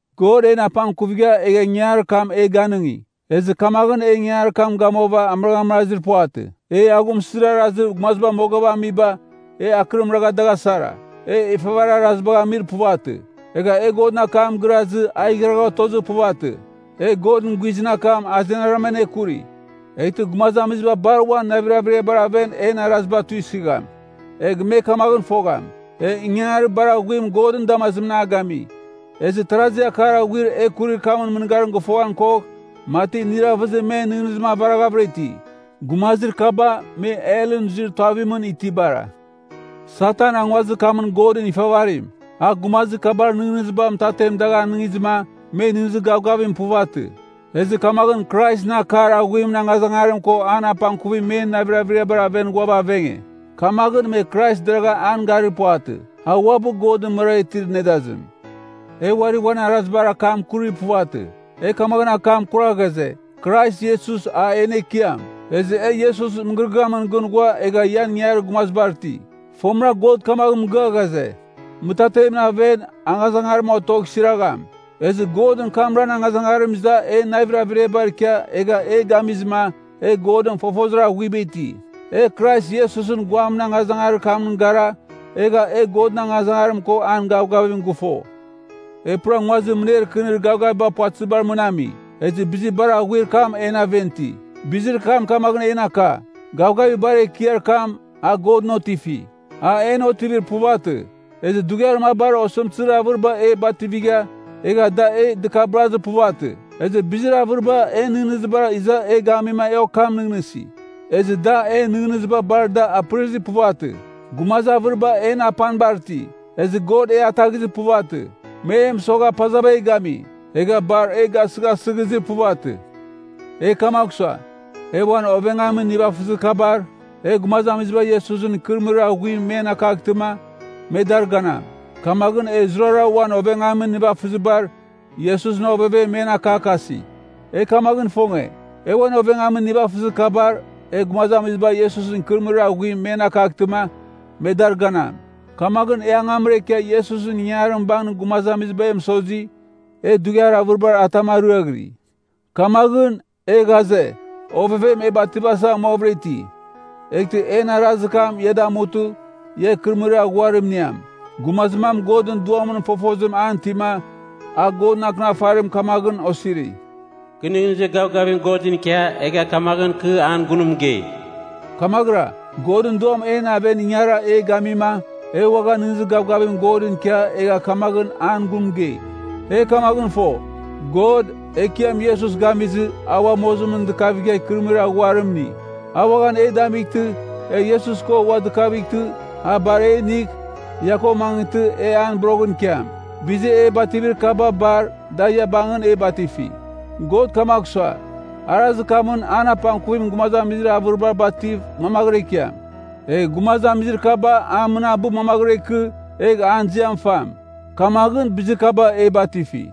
God en apangkuvigha egha ingangarir kam e ganɨngi. Ezɨ kamaghɨn e ingangarir kam gamuava amɨraghmɨrazir puvatɨ. E aghumsɨzir arazir gumaziba mogava amiba, e akɨrim ragha dagh asara. E ifavarir arazibagh amir puvatɨ. Egha e Godɨn akam girazɨ, a igharagha otozir puvatɨ. E Godɨn guizɨn akam azenarama anekuri, eghtɨ gumazamiziba bar uan navir averiabar aven en araziba tuisɨgham. Egh me kamaghɨn fogham, e ingangarir bar aghuim Godɨn damazimɨn a gami. Ezɨ tarazi akar aghuir e kurir kamɨn mɨngarim gɨfoghan kogh, mati iniravɨzim men nɨghnɨzim avaraghavɨra iti. Gumazir kaba, me helɨn zuir tuavimɨn itibara. Satan a nguazir kamɨn godɨn ifavarim, a gumazir kabar nɨghnɨziba mɨtatem dagh anɨngizɨma, me nɨghnɨzir gavgavim puvatɨ. Ezɨ kamaghɨn Kraisɨn akar aghuimɨn angazangarim ko an apangkuvim men navir averiabar aven ghuava avenge. Kamaghɨn, me Krais deragha an garir puvatɨ, a uabɨ Godɨn mɨrara itir nedazim. E uari uan arazibar akam kurir puvatɨ. E kamaghɨn akam akura ghaze, “Krais Iesus, a en Ekiam. Ezɨ e Iesusɨn mɨgɨrɨgɨamɨn gɨn ghua egha ian ingangarir gumazibar iti.” Fomɨra God kamaghɨn mɨgɨa ghaze, “Mɨtatemɨn aven, angazangarim otogh siragham.” Ezɨ Godɨn kamran angazangarim iza en navir averiabar ikia egha e gamizɨma, e Godɨn fofozir aghuiba iti. E Krais Iesusɨn guamɨn angazangarir kamɨn gara, egha e Godɨn angazangarim ko an gavgavim gɨfo. E pura nguazir mɨner kɨnir gavgaviba puvatɨziba mɨn ami, ezɨ bizir bar aghuir kam en aven iti. Bizir kam kamaghɨn en aka, gavgavir bar ekiar kam, a Godɨn otifi, an en otivir puvatɨ. Ezɨ dughiar mabar osɨmtɨzir avɨriba e bativigha, egha da e dɨkabɨrazir puvatɨ. Ezɨ bizir avɨriba en nɨghnɨzibar iza e gamima e okam nɨghnɨsi, ezɨ da en nɨghnɨziba bar da apɨrɨzir puvatɨ. Gumazir avɨriba en apanibar iti, ezɨ God e ataghizir puvatɨ. Me e mɨsogha pazava e gami, egha bar e gasɨghasɨghizir puvatɨ. E kamagh sua, e uan ovengamin nivafɨzir kabar, e gumazamiziba Iesusɨn ikɨrɨmɨrir aghuim men akaghtɨma, me dar ganam. Kamaghɨn e zurara uan ovengamin nivafɨzibar, Iesusɨn ovevem men akakasi. E kamaghɨn ifonge, e uan ovengamin nivafɨzir kabar, e gumazamiziba Iesusɨn ikɨrɨmɨrir aghuim men akaghtɨma, me dar ganam. Kamaghɨn e angamra ikia Iesusɨn ingangarim bangɨn gumaziba e mɨsozi, e dughiar avɨribar atam ariaghiri. Kamaghɨn, e ghaze, ovevem e bativasa amuavɨra iti, eghtɨ en arazir kam ia damutɨ, ia ikɨrɨmɨrir aghuarim iniam. Gumazir mam Godɨn Duamɨn fofozim an itima, a Godɨn Akɨnafarim kamaghɨn osiri, “Kɨ nɨghnɨzir gavgavim Godɨn ikia, egha kamaghɨn kɨ an gun mɨgei.” Kamaghɨra, Godɨn Duam en aven ingara e gamima, e uaghan nɨghnɨzir gavgavim Godɨn ikia egha kamaghɨn an gun mɨgei. E kamaghɨn fo, God, Ekiam Iesus gamizɨ, a ua mozimɨn dɨkavigha ikɨrɨmɨrir aghuarim ini. A uaghan e damightɨ, e Iesus ko ua dɨkavightɨ, a bar e inigh, ia ko mangɨtɨ, e an boroghɨn ikiam. Bizir e bativir kaba bar, da ia bangɨn e batifi. God kamagh sua, arazir kamɨn an apangkuvim gumazamizir avɨriba bativ mangvɨra ikiam. Egh gumazamizir kaba a mɨnabɨ mangvɨra ikɨ, egh an ziam fam. Kamaghɨn bizir kaba e batifi.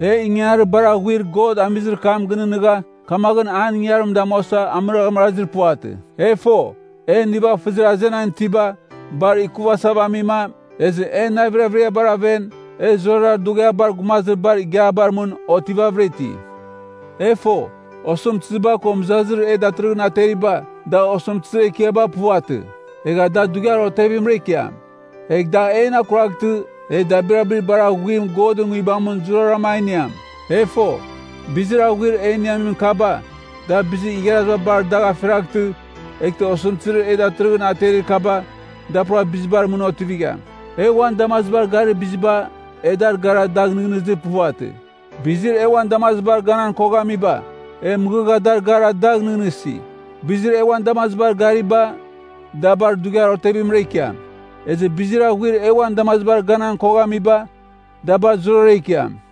E ingangarir bar aghuir God amizir kam gɨnɨghnɨgha, kamaghɨn an ingangarim damuasa amɨraghamɨrazir puvatɨ. E fo, en nivafɨzir azenan itiba, bar ikuvighasava amima, ezɨ en navir averiabar aven, e zurara dughiabar gumazir bar igiabar mɨn otivavɨra iti. E fo, osɨmtɨziba ko mɨzazir e datɨrɨghɨn ateriba, da osɨmtɨzir ekiaba puvatɨ. Egha da dughiar otevimra ikiam. Egh da en akuraghtɨ, e dabirabir bar aghuim Godɨn Nguibamɨn zurazurara a iniam. E fo, bizir aghuir e iniamin kaba, da bizir igharaziba bar dagh afiraghtɨ, eghtɨ osɨmtɨzir e datɨrɨghɨn aterir kaba, da pura bizibar mɨn otivigham. E uan damazibar garir biziba, e dar gara dagh nɨghnɨzir puvatɨ. Bizir e uan damazibar ganan koghamiba, e mɨghɨgha a dar gara dagh nɨghnɨsi. Bizir e uan damazibar gariba, da bar dughiar otevimra ikiam. Ezɨ bizir aghuir e uan damazibar ganan koghamiba, da bar zurara ikiam.